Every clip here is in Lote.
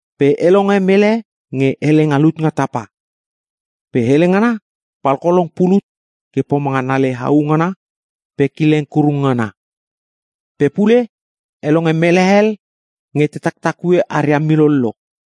Pe e longe mele nge hele nga lut nga tapa. Pe hele ngana palkolong pulut ke pomanga nale hau ngana pe kileng kurung ngana. Pe pule e longe mele hel nge te taktakue aria milollo.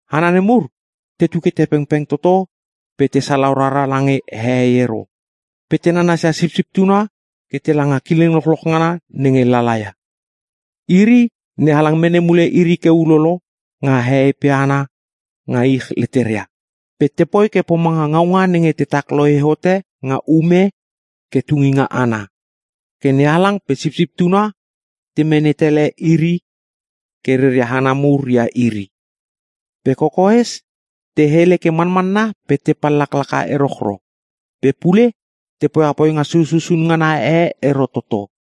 Hana nemur tetu ke te pengpeng toto pe te salau rara lange hehei ero. Pe te nanasia Sipsip Tuna ke tela nga kileng lochloch ngana nenge lala ia. Iri NeHalang mene mule iri ke ulolo nga hehei pe hana nga ich leteria. Pe tepoi ke pomanga ngaunga nenge tetak lohe hote nga ume ke tunginga ana. Ke NeHalang pe Sipsip Tuna te mene tele iri ke reria hana mur ia iri. Pe kokoes te hele ke manmanna pe te pallaklaka erochro. Pe pule te poia poinga sususun ngana e ero toto.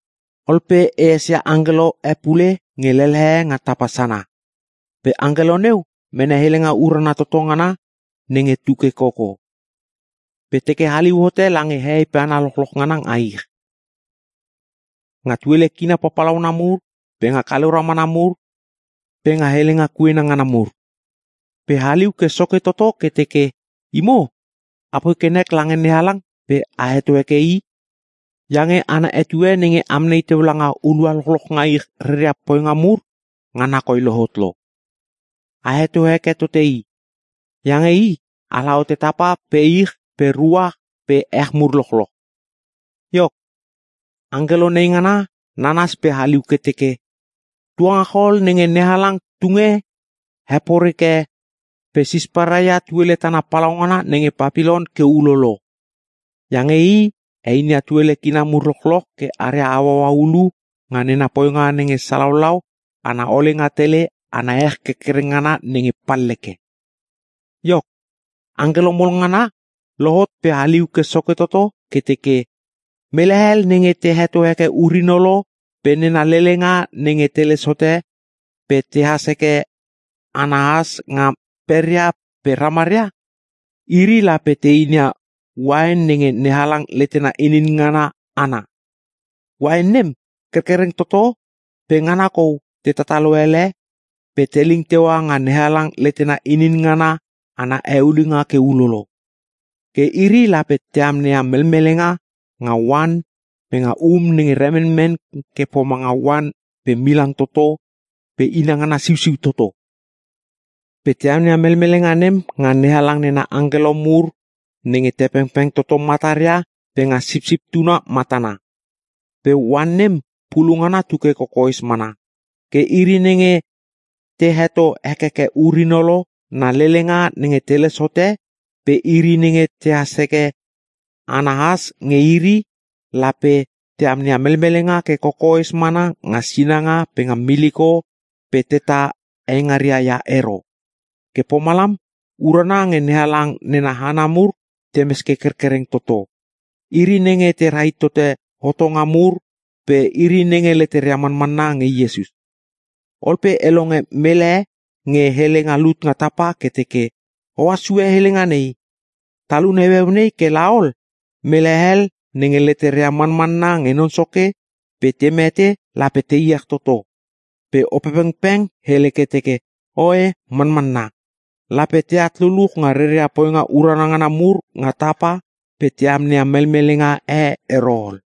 Ol pe e esia angkelo e pule nge lelehe nga tapa sana. Pe angkelo neu mene helenga urana toto ngana nenge tuke koko. Pe teke haliu hote lange hehei pe hana lochloch ngana nga ich. Nga tuele kina papalauna mur, pe nga kaleu ramana mur, pe nga helenga kuena ngana mur. Pe haliu ke soke toto ke teke, “Imo apoi ke nek lange NeHalang pe a heto heke I, iange ana etue nenge amnei teu nga hulua lochloch nga ich reria poinga mur ngana koi lohot lo. A heto heke tote I. Iange I ala hote tapa pe ich pe ruach pe ech mur lochloch.” Iok, angkelo neingana nanas pe haliu ke teke, “Tuangachol nenge NeHalang tunge heporeke pe sisparai ia tuele tana palaugana nenge Papilon ke ulolo! Iange i heinia tuele kina mur lochloch ke aria hauaua hulu nga nena poinga nenge salaulau ana olenga tele ana ech kerkereng ngana nenge palleke.” Iok, angkelo mol ngana lohot pe haliu ke soke toto ke teke, “Mele hel nenge te heto heke ur-inolo pe nena lelenga nenge teles hote pe tehas heke ana has nga peria pe nga ramaria, iri lape te inia uain nenge NeHalang letena inin ngana ana. Uain nem kerkereng toto pe ngana kou te tatalo ele, pe teling teua nga NeHalang letena inin ngana ana eulinga ke ulolo. Ke iri lape te amneia melmelenga nga oan pe nga um nenge remenmen ke pomanga oan pe milang toto pe inangana siusiu toto. Pe te amneia melmelenga nem nga NeHalang nena angkelo mur nenge te pengpeng toto mataria pe nga Sipsip Tuna matana. Pe oan nem pulu ngana tuke kokoes mana. Ke iri nenge te heto hekeke ur-inolo pe na lelenga nenge teles hote pe iri nenge tehas heke ana has nge iri, lape te amneia melmelenga ke kokoes mana nga sinanga pe nga miliko pe tetah eingaria ia ero.” Ke pomalam, urana nge NeHalang nena hana mur temes ke kerkereng toto. Iri nenge te rahit tote nena hotonga mur pe iri nenge leteria manmanna nge Iesus. Ol pe e longe mele nge hele nga lut nga tapa ke teke, “Ohas sue helenga nei ‘Talun heueu nei ke laol mele hel nenge leteria manmanna nge Non Soke pe te mete lape te iech toto.’” Pe Opepengpeng hele ke teke, “Oe, manmanna! Lape teat luluch nga reria poinga urana ngana mur nga tapa pe te amneia melmelenga e ero ol.”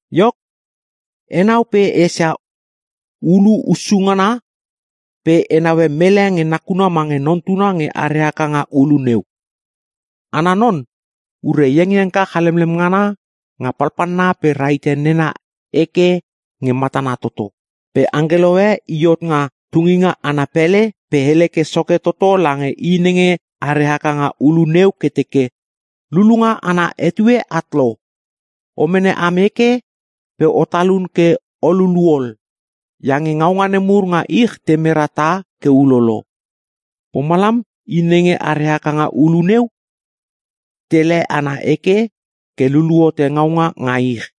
Iok, enau pe e esia ulu hussu ngana pe e naue mele nge nakuna mange Non Tuna nge are haka nga ulu neu. Ana non ure iengiengka chalemlem ngana nga palpalna pe rahite nena eke nge matana toto. Pe angkelo e i hot nga tunginga ana pele pe hele ke soke toto lange I nenge are haka nga ulu neu ke teke, “Lulunga ana etue at lo! O mene am eke pe o talun ke o lulu ol, iange ngaunga nemur nga ich te mera tah ke ulolo.” Pomalam I nenge are haka nga ulu neu, tele ana eke ke lululu hote ngaunga nga ich.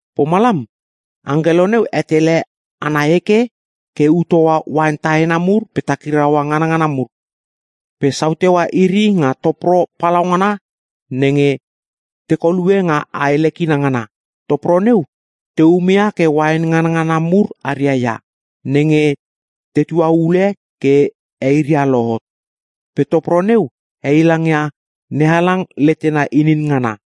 Pomalam angkelo neu hetele ana eke ke ut hoa uain tahena mur pe takiraua nganangana mur. Pe sau teua iri nga topro palaungana nenge te kolue nga ae lekina ngana. Topro neu te umeia ke uain nganangana mur aria ia, nenge tetua ule iri ke eiria lohot. Pe topro neu heilangia NeHalang letena inin ngana.